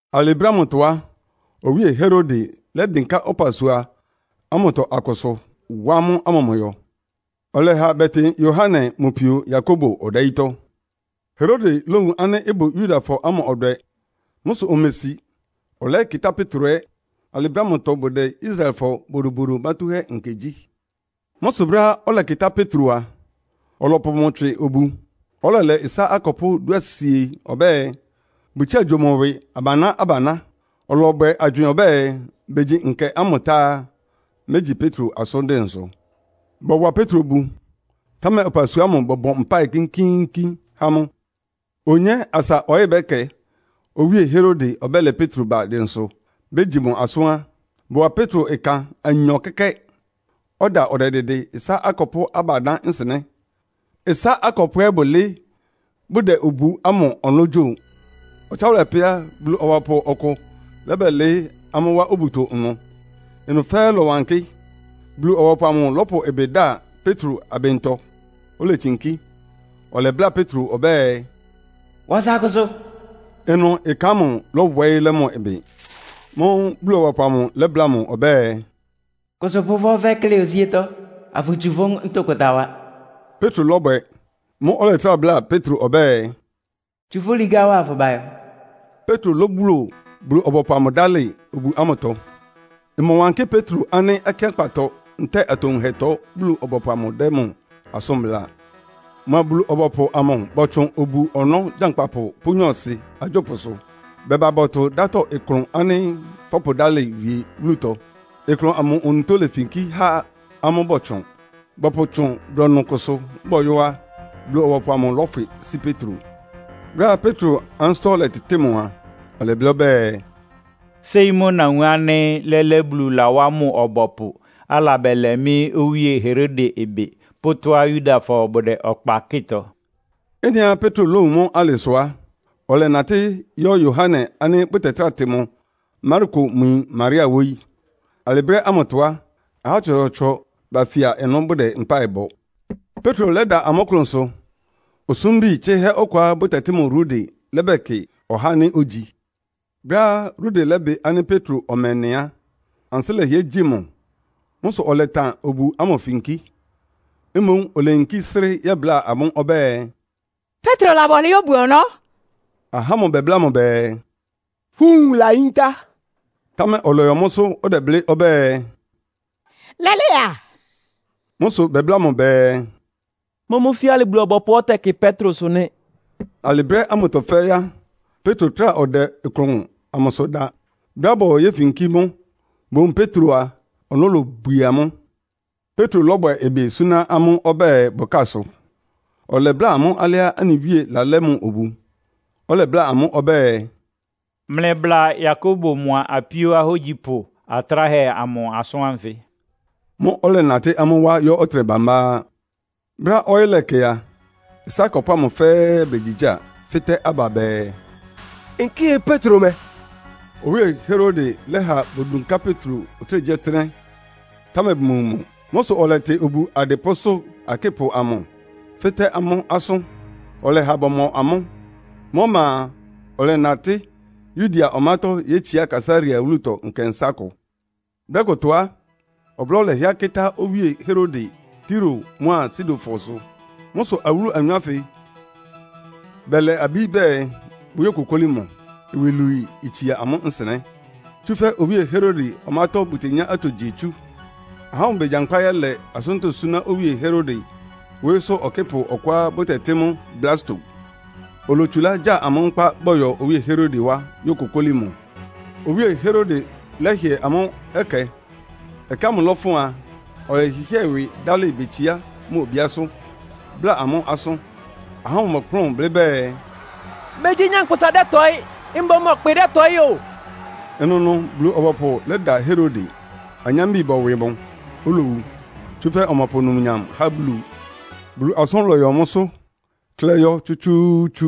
Alɩ brɛ́ ámʋtɔ á, Owíe Herode lɛ́dɩnká ɔpasua ámʋtɔ akʋsʋ, wá amʋ́ amʋmʋyɔ. Ɔlɛha bɛtɩn Yohane mʋ pio Yakobo ɔdayítɔ́. Herode lówun ánɩ́ ɩbʋ Yudafɔ ámʋ ɔdwɛ. Mʋ́ sʋ omesi, ɔlɛyɛ́kɩtá Petro ɛ́. Alɩ brɛ́ ámʋtɔ bʋdɛ Israelfɔ Bodobodo Mátúhɛ́Nkɛ gyí. Mʋ́ sʋ brɛ́á ɔlɛkɩtá Petro a, ɔlɔpʋ mʋ tswɩ obu, ɔlɛlɛ ɩsá akɔpʋ́ dúasie ɔbɛ́ɛ, bʋtsía gyo mʋ ɩwɩ abaná-abaná. Ɔlɔbwɛ agywɩɩn ɔbɛ́ɛ, begyi Nkɛ ámʋ tá á, mégyi Petro asʋ́n dɩnsʋ. Bɔwa Petro obu, támɛ ɔpasua ámʋ bɔbɔ mpáɩ kínkíínkín há mʋ. Onyé asa ɔyɩ́ ɔbɛ́kɛ Owíe Herode ɔbɛ́lɛ Petro ba dɩnsʋ begyi mʋ asʋ́n á, bɔwa Petro ɩkan anyɔ kɛ́kɛ́, ɔda ɔdɛdɩdɩ ɩsá akɔpʋ́ abanyɔ́ nsɩnɛ́. Ɩsá akɔpʋ́ akʋ ɛ́ bʋlɩɩ́ bʋdɛ obu ámʋ ɔnɔ́ gyo. Ɔtsáwʋlɛ pɛ́ á, Bulu-ɔbɔpʋ ɔkʋ lɛ́bɛlɩɩ́ amʋ́ wá obuto ɩnʋ, ɩnʋ fɛ́ɛ́ lɔ́wankɩ́. Bulu-ɔbɔpʋ amʋ lɔ́pʋ ɩbɩ da Petro abɩntɔ, oletsinkí. Ɔlɛbláa Petro ɔbɛ́ɛ, “Wa ɔsa kʋsʋ.” Ɩnʋ ɩkan amʋ lɔ́wɔɩ́ lɛ́ mʋ ɩbɩ. Mʋ́ʋ́ Bulu-ɔbɔpʋ amʋ lɛ́bláa mʋ ɔbɛ́ɛ, “Kʋsʋ pʋ ɔfɛ́ klɩ́ osíétɔ́, afʋtsu fʋ́ ntʋkʋta wa.” Petro lɔ́bwɛ. Mʋ́ʋ́ ɔlɛtrá bláa Petro ɔbɛ́ɛ, “Tsu fʋ́ ligá wa afʋba ayɔ.” Petro lóbuo Bulu-ɔbɔpʋ amʋ dálɩ obu ámʋtɔ. Ɩmɔwankɩ́ Petro nɩ́ akɩ́ankpatɔ ntɛ́ɛ atowunhɛtɔ Bulu-ɔbɔpʋ amʋ dɛ́ mʋ asʋ́n bláa. Mʋa Bulu-ɔbɔpʋ amʋ bɔtsʋn obu-ɔnɔ́ gyankpapʋ pʋ́ nyɔɔsɩ agyópʋsʋ. Bɛba bɔtʋ dátɔ ɩklʋn ánɩ́ fɔ́pʋdálɩ wie wúlutɔ. Ɩklʋn amʋ onutó lefinkí há amʋ́ bɔtsʋn. Bɔpʋtsʋn brɔnʋ kʋsʋ bɔyɔ́ á, Bulu-ɔbɔpʋ amʋ lɔ́fwɩ sí Petro. Brɛ́á Petro ansɩ́tɔ́ lɛtɩtɩ́ɩ mʋ a, ɔlɛblɩ́ ɔbɛ́ɛ, “Séi mʋ́ nawun ánɩ́ lɛ́lɛ́ Bulu lawá mʋ ɔbɔpʋ, alabɛlɛ mɩ́ Owíe Herode ɩbɩ pʋ́ tɔ́á Yudafɔ bʋdɛ ɔkpa kɩ́tɔ.” Ɩ́nɩá Petro lówun mʋ́ alɩ sʋ á, ɔlɛnatɩ́ yɔ́ Yohane ánɩ́ bʋtɛtráa tɩ mʋ Marko mʋ yin Maria wóyí. Alɩ brɛ́ ámʋtɔ á, ahá tsɔtsɔɔtsɔ bafia ɩnʋ bʋdɛ mpáɩ bɔ. Petro lɛ́da amʋ́ ɩklʋnsʋ, osúmbi tsɩhɛ́ ɔkʋá bʋtɛtɩ́ mʋ Rode lɛ́bɛkɩ ɔhá ánɩ́ ogyi. Brɛ́á Rode lɛ́bɩ ánɩ́ Petro ɔmɛ nɩ á, ansɩ́ lɛhɩɛ gyi mʋ. Mʋ́ sʋ ɔlɛtan obu ámʋ finkí. Mboún oleyinkí srɩ́ yɛ́bláa amʋ́ ɔbɛ́ɛ, “Petro laba ɔlɩɩ́ obu-ɔnɔ́.” Ahá ámʋ bɛbláa mʋ bɛɛ, “Fʋ́ nwun layíntá.” Támɛ ɔlɔyɔ mʋ́sʋ́, ɔdɛblɩ́ ɔbɛ́ɛ, “Lɛ́lɛ́ a.” Mʋ́ sʋ bɛbláa mʋ bɛɛ, “Mʋ́mʋ́ fíalɩ Bulu-ɔbɔpʋá ɔtɛkɩ Petrosʋ nɩ́.” Alɩ brɛ́ ámʋtɔ fɛ́ɛ́ á, Petro trá ɔdɛ ɩklʋn amʋsʋ da. Brɛ́á bɔyɔ yéfinkí mʋ́, bowun Petro a, ɔnɔ́ lobwie amʋ́. Petro lɔ́bwɛ ɩbɩ súná amʋ́ ɔbɛ́ɛ bʋkásʋ, ɔlɛbláa amʋ́ alɩá anɩ Wíe lalɛ́ mʋ obu. Ɔlɛbláa amʋ́ ɔbɛ́ɛ, “Mlɩbla Yakobo mʋa apíó ahógyipʋ atráhɛ amʋ asʋ́n ánfɩ.” Mʋ́ʋ́ ɔlɛnatɩ́ amʋ́ wá yɔ́ ɔtɩnɛ bambá á. Brɛ́á ɔyɩ́ lɛkɛ a, ɩsá akɔpʋ́ ámʋ fɛ́ɛ́ begyigyáa, fɩ́tɛ́ aba bɛɛ, “Nkɩ́ɩ Petro mɛ?” Owíe Herode lɛ́ha bodunká Petro ɔtɩ́nɛgyíɔtɩ́nɛ́, támɛ bʋmowun mʋ. Mʋ́ sʋ ɔlɛtɩ obu adɩpʋ́sʋ́ akɩ́pʋ amʋ, fɩ́tɛ́ amʋ́ asʋ́n, ɔlɛha bɔmɔ amʋ́. Mʋ́ ɔma a, ɔlɛnatɩ́ Yudea ɔmátɔ́ yétsiá Kaesarea wúlutɔ nkɛnsá kʋ. Brɛ́ kʋtɔ á, ɔblɔ́ lɛhɩɛ kɩ́tá Owíe Herode Tiro mʋ́a Sidonfɔ sʋ. Mʋ́ sʋ awúlu anyɔ ánfɩ bɛlɛ abí bɛɛ bʋyókokóli mʋ, iwilwii itsia amʋ́ nsɩnɛ́. Tsúfɛ́ Owíe Herode ɔmátɔ́ bʋtenyá atogyihɛ tsú. Ahá ámʋ begyankpá yɛ́lɛ asʋ́ntɔ́ súná Owíe Herode wóyísʋ́ ɔkɩ́pʋ ɔkʋá bʋtɛtɩ́ mʋ Blasto, olotsulá gya amʋ́ nkpá bɔyɔ Owíe Herode wá yókokóli mʋ. Owíe Herode lɛ́hɩɛ amʋ́ ɛkɛ. Ɛkɛ ámʋ lɔ́fʋn a, ɔlɛhɩhɩ́ɛ ɩwɩ dálɩ betsiá mʋ obíásʋ́, bláa amʋ́ asʋ́n. Ahá ámʋ bɔkplʋ́n blɩ́ bɛɛ, “Megyí nyankpʋsa dɛ́tɔɩ́, mboún ɔkpɩ dɛ́tɔɩ́ o!” Ɩnʋnʋ Bulu-ɔbɔpʋ lɛ́da Herode, anyambi bɔwɩ mʋ, olowu. Tsúfɛ́ ɔmɔpʋ numnyam há Bulu. Bulu asʋ́n lɔyɔ mʋ́sʋ́, klɛ́ɩ́ yɔ́ tsútsúútsú.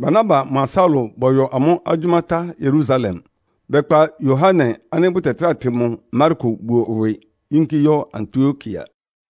Barnaba mʋa Saulo bɔyɔ amʋ́ agyʋ́má tá Yerusalem, bɛkpa Yohane ánɩ́ bʋtɛtráa tɩ mʋ Marko buo ɩwɩ yínkí yɔ́ Antiokia.